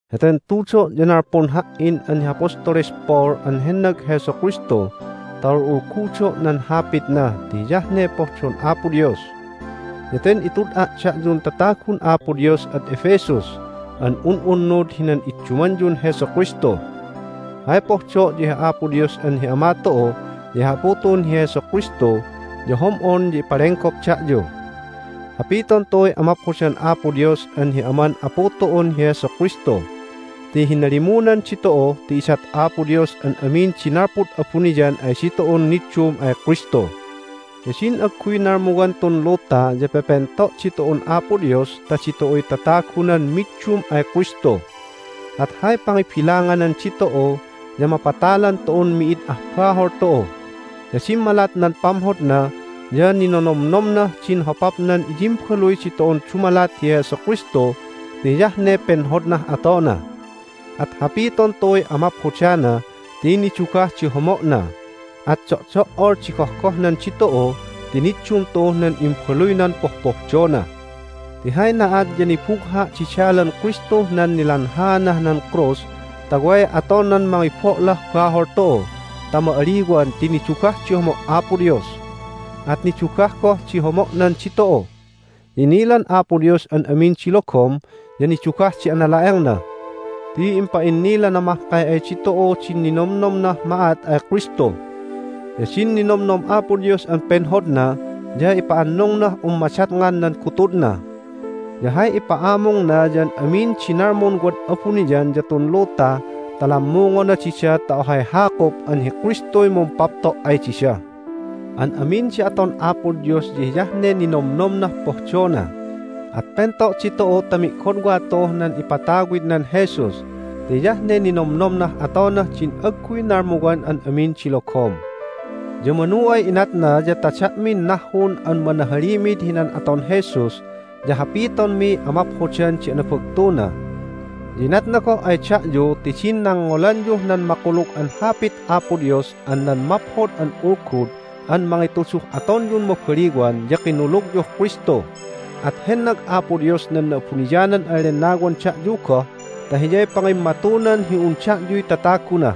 Heten tudo' ya nalpun ha"in an hi Apostoles Paul an hennag Jesu Kristu ta ul'ulgudo' nan Hapitna ti hiyah ne pohdon Apo Dios. Ya ten itud'a' da'yun tatagun Apo Dios ad Ephesus an un'unnud hinan iddumanyun Jesu Kristu. Hay pohdo' ya hi Apo Dios an hi Ama tu'u ya hi Apu tu'un hi Jesu Kristu ya hom'on ya ipalenggop da'yu. Hapiton tu'uy amaphodan Apo Dios an hi Aman Apu tu'un hi Jesu Kristu! Ti hinalimunan ditu'u ti idat Apo Dios an amin di nalpud abuniyan ay ditu'un niddum ay Kristu. Ya din agguy nalmuwan tun luta ya pepento' ditu'un Apo Dios ta ditu'uy tatagunan middum ay Kristu. At hay pangibilanganan ditu'u ya mapatalan tu'un mi'id ah bahol tu'u. Ya dimmalat nan pamhodna ya ninonomnomnah din hopapnan iyimbaluy ditu'un dumalat hi Jesu Kristu ti hiyah ne penhodnah atona. At hapiton tu'uy amaphodana ti nidugah di homo'na. At do'do"ol di gohgohnan ditu'u ti niddum tu'uh nan Imbaluynan pohpohdona! Ti hay na'at ya nibugha' di dalan Kristuh nan nilanhaanah nan krus ta way atonan mangibo'lah bahol tu'u ta ma'aliwan ti nidugah di homo' Apo Dios, at nidugah goh di homo'nan ditu'u! Ya inilan Apo Dios an amin di logom, ya nidugah di anala'engna ti impa'innilana mahkay ay ditu'u din ninomnomnah ma'at ay Kristu. Ya din ninomnom Apo Dios an penhodna ya ipa'annungnah un madatngan nan gutudna. Ya hay ipa'amungna ya an amin di nalmun wad abuniyan ya tun luta ta lammungona dida ta ohay hakup an hi Kristuy mumpapto' ay dida. An amin di aton Apo Dios ya hiyah ne ninomnomnah pohdona, at pento' ditu'u ta mi'godwa tu'uh nan ipatawidnan Jesus, ti hiyah ne ninomnomnah atonah din agguy nalmuwan an amin di logom. Ya manu ay inatna ya ta da'min nahhun an manahalimid hinan aton Jesus ya hapitonmiy amaphodan di anabagtuna! Ya inatna goh ay da'yu ti din nangngolanyuh nan Makulug an Hapit Apo Dios an nan Maphod an Ulgud an mangituduh atonyun mabaliwan ya kinulugyuh Kristu. At hennag Apo Dios nan Na'abuniyanan an Lennawan da'yu goh ta Hiyay pangimmatunan hi un da'yuy tataguna.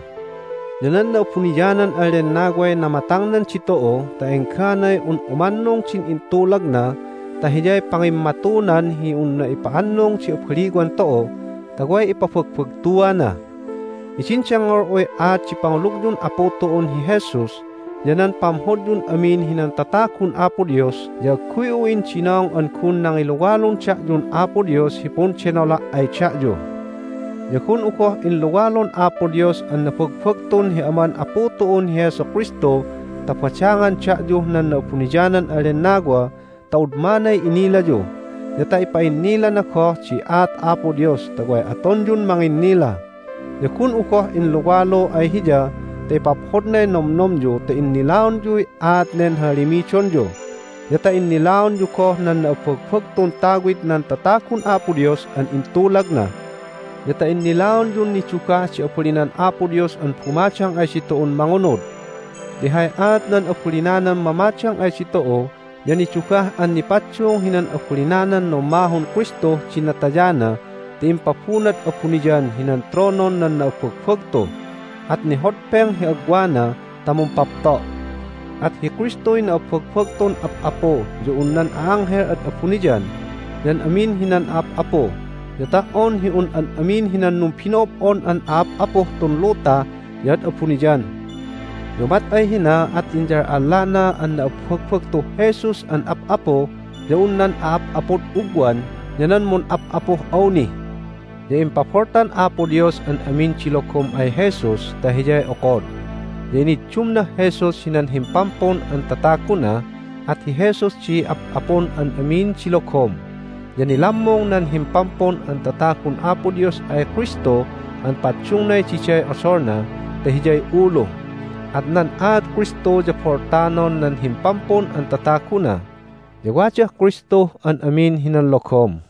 Ya nan Na'abuniyanan an Lennaway namatangnan ditu'u ta engganay un umannung din intulagna ta Hiyay pangimmatunan hi unna ipa'annung di abaliwan tu'u ta way ipabagbagtuana! Hidin dengngol'uy aat di pangulugyun Apu tu'un hi Jesus ya nan pamhodyun amin hinan tatagun Apo Dios ya agguy'u indinong an gun nangiluwalun da'yun Apo Dios hi pundenola' ay da'yu. Ya gun'u goh inluwalun Apo Dios an nabagbagtun hi Aman Apu tu'un hi Jesu Kristu ta badangan da'yuh nan Na'abuniyanan an Lennawa ta udmanay inilayu, ya ta ipa'innilana goh di aat Apo Dios ta way atonyun manginnila. Ya gun'u goh inluwalu ay Hiya ta ipaphodnay nomnomyu ta innilaonyuy aat nen hahalimidonyu, ya ta innilaonyu goh nan na'abbagbagtun tawid nan tatagun Apo Dios an intulagna, ya ta innilaonyun nidugah di abalinan Apo Dios an bumadang ay ditu'un mangunud. Ti hay aat nan abalinanan mamadang ay ditu'u ya nidugah an nipaddung hinan abalinanan nummahun Kristuh din natayana ti impabunad abuniyan hinan tronon nan na'abbagbagtu, at nihodpeng hi agwana ta mumpapto'. At hi Kristuy na'abbagbagtun ap'apu ya un nan a'anghel ad abuniyan, ya an amin hinan a'ap'apu, ya ta"on hi un an amin hinan numbino'ob'on an a'ap'apuh tun luta ya ad abuniyan. Ya umat ay hina at inyal'allana an na'abbagbagtuh Jesus an ap'apu ya un nan a'ap'apud ugwan ya nan mun'ap'apuh awni. Ya impaboltan Apo Dios an amin di logom ay Jesus ta Hiyay okod. Ya iniddumnah Jesus hinan Himpampun an Tataguna, at hi Jesus di ap'apun an amin di logom. Ya nilammung nan Himpampun an Tatagun Apo Dios ay Kristu an paddungnay diday odolna ta Hiyay ulu. At nan aat Kristu ya boltanon nan Himpampun an Tataguna, ya wadah Kristuh an amin hinan logom.